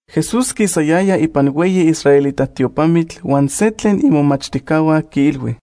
Jesús quisayaya ipan hueyi israelita tiopamitl huan se tlen imomachtijcahua quiilhui: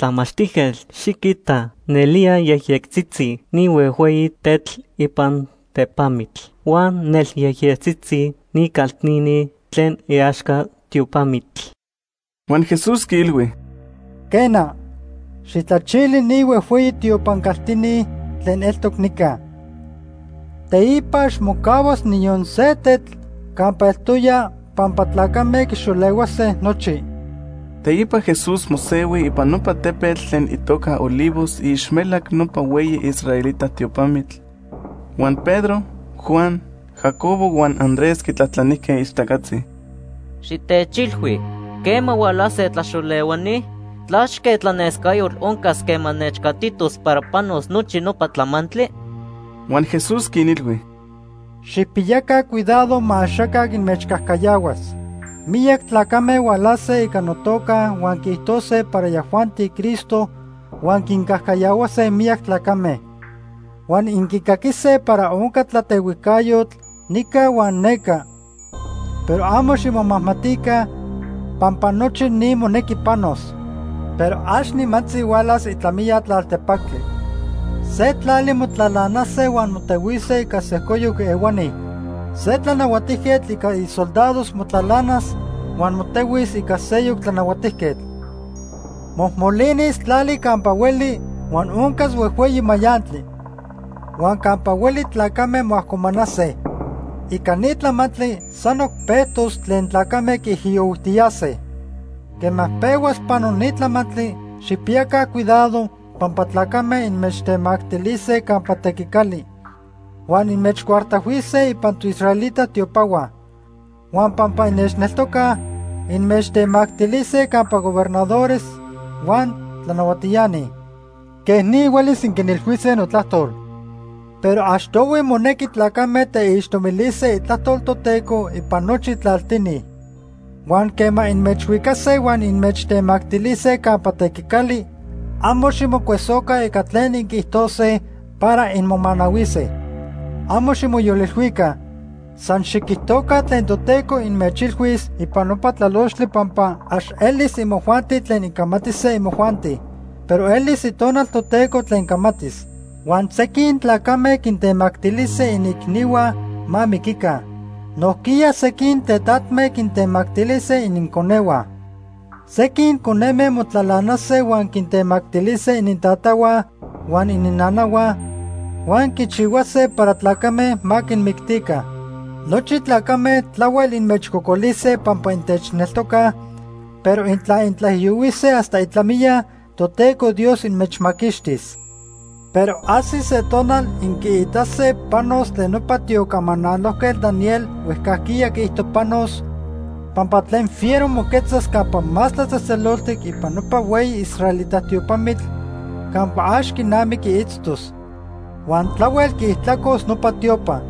―¡Tlamachtijquetl, xiquita! Nelía yejyectzitzi ni huejhueyi tetl ipan tepamitl huan nelyejyectzitzi ni caltini tlen iaxca tiopamitl. Huan Jesús quiilhui: ―Quena, xijtlachili ni huejhueyi tiopan caltini tlen eltoc nica. Teipa ax mocahuas niyon se tetl campa eltoya pampa tlacame quixolehuase nochi. Teipa Jesús mosehui ipan nopa tepetl tlen itoca Olivos iixmelac nopa hueyi israelita tiopamitl, huan Pedro, Juan, Jacobo huan Andrés quitlajtlanijque ixtacatzi: ―Xitechilhui, ¿quema hualase tlaxolehuani? ¿Tlachque tlanescayotl oncas quema nechcatitos para panos nochi nopa tlamantli? Huan Jesús quinilhui: ―Xijpiyaca cuidado ma axaca inmechcajcayahuas. Miyac tlacame hualase ica notoca huan quiijtose para yajuanti Cristo huan quincajcayahuase miyac tlacame. Huan inquicaquise para onca tlatehuijcayotl nica huan neca, pero amo ximomajmatica, pampa nochi ni monequi panos. Pero ax nimantzi hualas itlamiya tlaltepactli. Se tlali motlalanase huan motehuise ica sejcoyoc ehuani. Se tlanahuatijquetl ica isoldados motlalanas huan motehuis ica seyoc tlanahuatijquetl. Mojmolinis tlali campa hueli huan oncas huejhueyi mayantli. Huan campa hueli tlacame moajcomanase. Ica ni tlamantli sanoc pejtos tlen tlacame quiijiyohuijtiyase. Quema pehuas pano ni tlamantli, xijpiyaca cuidado pampa tlacame inmechtemactilise campa tequicali, huan inmechcuartajhuise ipan toisraelita tiopahua. Huan pampa innechneltocaj, inmechtemactilise campa gobernadores huan tlanahuatiani. Quej ni huelis inquinilhuise notlajtol. Pero achtohui monequi tlacame teixtomilise Itlajtol Toteco ipan nochi tlaltini. Huan quema inmechhuicase huan inmechtemactilise campa tequicali, amo ximocuesoca ica tlen inquiijtose para inmomanahuise. Amo ximoyolilhuica. San xiquijtoca tlen Toteco inmechilhuis ipan nopa tlalochtli pampa ax elis imojuanti tlen incamatise imojuanti, pero elis Itonal Toteco tlen camatis. Huan sequin tlacame quintemactilise iniicnihua ma miquica. Nojquiya sequin tetatme quintemactilise ininconehua. Sequin coneme motlalanase huan quintemactilise inintatahua huan ininnanahua huan quichihuase para tlacame ma quinmictica. Nochi tlacame tlahuel inmechcocolise pampa intechneltocaj, pero intla intlaijiyohuise hasta itlamiya, Toteco Dios inmechmaquixtis. “Pero ajsis se tonal inquiitase panos tlen nopa tiocamanalojquetl Daniel huejcajquiya quiijto panos, pampa tlen fiero moquetzas Campa Más Tlatzejtzeloltic ipan nopa hueyi israelita tiopamitl campa ax quinamiqui itztos. Huan tlahuel quiijtlacos nopa tiopa.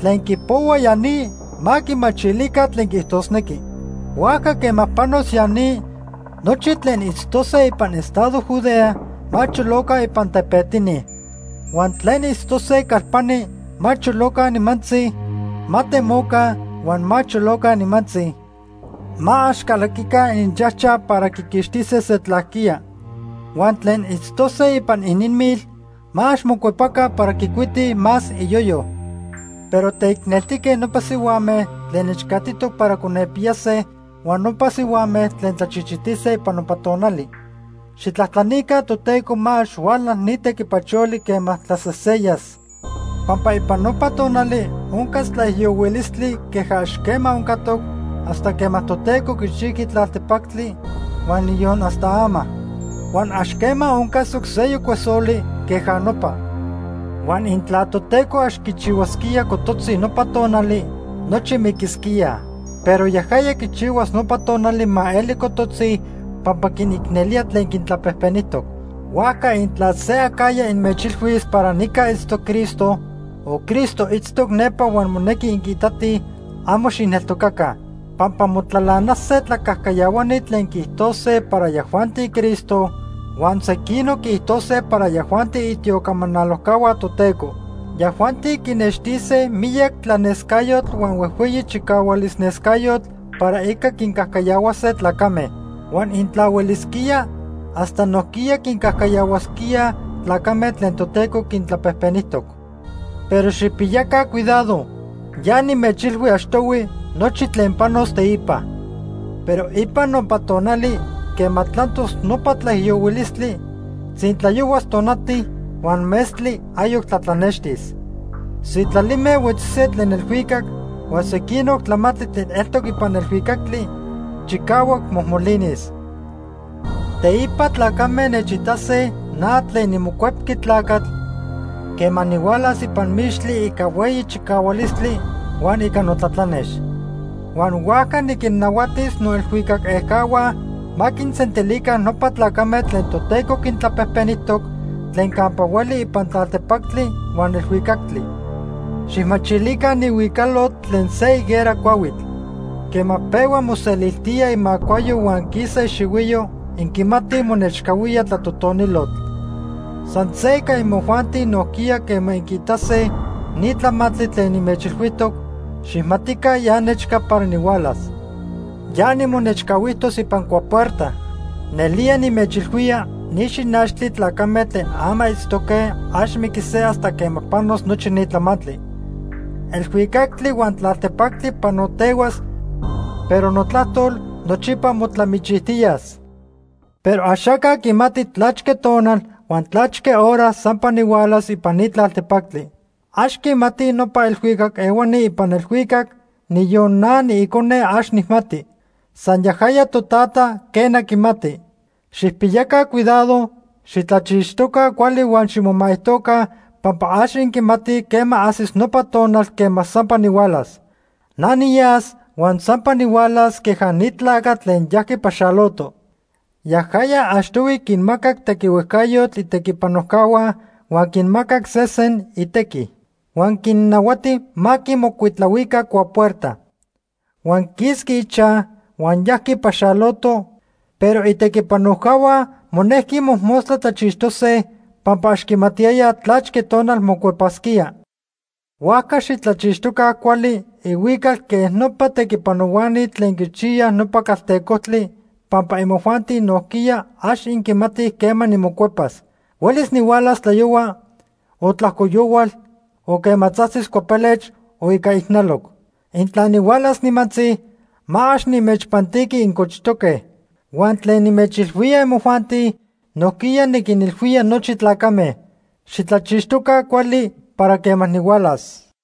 (Tlen quipohuaj ya ni, ma quimachilica tlen quiijtosnequi.) Huajca quema panos ya ni, nochi tlen itztose ipan estado Judea ma choloca ipan tepetini. Huan tlen itztose calpani ma choloca nimantzi; ma temoca huan ma choloca nimantzi; ma ax calaquica ininchajchaj para quiquixtise se tlajquía. Huan tlen itztose ipan ininmil ma ax mocuepaca para quicuitij más iyoyo. ¡Pero teicneltique nopa sihuame tlen nechcatitoc para conepiyase huan nopa sihuame tlen tlachichitise ipan nopa tonali! Xijtlajtlanica Toteco ma ax huala ni tequipacholi quema tlaseseyas, pampa ipan nopa tonali oncas tlaijiyohuilistli queja ax quema oncatoc hasta quema Toteco quichijqui tlaltepactli huan niyon hasta ama. Huan ax quema oncasoc seyoc cuesoli queja nopa. Huan intla Toteco ax quichihuasquía cototzi nopa tonali, nochi miquisquíaj. Pero yajaya quichihuas nopa tonali ma eli cototzi pampa quinicnelía tlen quintlapejpenijtoc. “Huajca intla se acajya inmechilhuis para nica itztoc Cristo, o Cristo itztoc nepa huan monequi inquiitatij, amo xijneltocaca. Pampa motlalanase tlacajcayahuani tlen quiijtose para yajuanti Cristo, huan sequinoc quiijtose para yajuanti itiocamanalojcahua Toteco. Yajuanti quinextise miyac tlanescayotl huan huejhueyi chicahualis nescayotl para ica quincajcayahuase tlacame. Huan intla huelisquía, hasta nojquiya quincajcayahuasquíaj tlacame tlen Toteco quintlapejpenijtoc. Pero xijpiyaca cuidado, ya nimechilhui achtohui nochi tlen panos teipa. “Pero ipan nopa tonali, quema tlantos nopa tlaijiyohuilistli, tzintlayohuas tonati, huan metztli ayoc tlatlanextis. Sitlalime huetzise tlen elhuicac, huan sequinoc tlamantli tlen eltoc ipan elhuicactli chicahuac mojmolinis. Teipa tlacame nechitase na tlen niMocuepqui Tlacatl quema nihualas ipan mixtli ica hueyi chicahualistli huan ica notlatlanex. Huan huajca niquinnahuatis noelhuicac ejcahua ma quinsentilica nopa tlacame tlen Toteco quintlapejpenijtoc tlen campa hueli ipan tlaltepactli huan elhuicactli. “Xijmachilica ni huicalotl tlen se higuera cuahuitl. Quema pehua moseliltía imacuayo huan quisa ixihuiyo, inquimatij monechcahuía tlatotonilotl. San se ica imojuanti nojquiya quema inquiitase ni tlamantli tlen nimechilhuijtoc, xijmatica ya nechca para nihualas. Ya nimonechcahuijtos ipan cuapuerta. Nelía nimechilhuía, ni xinachtli tlacame tlen ama itztoque ax miquise hasta quema panos nochi ni tlamantli. Elhuicactli huan tlaltepactli panotehuas, pero notlajtol nochipa motlamichijtiyas. “Pero axaca quimati tlachque tonal huan tlachque hora sampa nihualas ipan ni tlaltepactli. Ax quimatij nopa elhuicac ehuani ipan elhuicac, niyon na niIcone ax nijmati. San yajaya Totata, quena quimati. Xijpiyaca cuidado, xitlachixtoca cuali huan ximomaijtoca pampa ax inquimatij quema ajsis nopa tonal quema sampa nihualas. Na niyas huan sampa nihualas queja ni tlacatl tlen yajqui paxaloto. Yajaya achtohui quinmacac tequihuejcayotl itequipanojcahua huan quimacac sesen itequi. Huan quinnahuati ma quimocuitlahuica cuapuerta. Huan quisqui ichaj huan yajqui paxaloto, pero itequipanojcahua monejqui mojmostla tlachixtose pampa ax quimatiyayaj tlachque tonal mocuepasquía. Huajca xitlachixtoca cuali ihuical quej nopa tequipanohuani tlen quichiyaj nopa caltecojtli pampa imojuanti nojquiya, ax inquimatij quema nimocuepas. Huelis nihualas tlayohua, o tlajco yohual, o quema tzajtzis cuapelech o ica ijnaloc. Intla nihualas nimantzi, ma ax nimechpantiqui incochtoque. Huan tlen nimechilhuía imojuanti, nojquiya niquinilhuía nochi tlacame: ¡Xitlachixtoca cuali para quema nihualas!”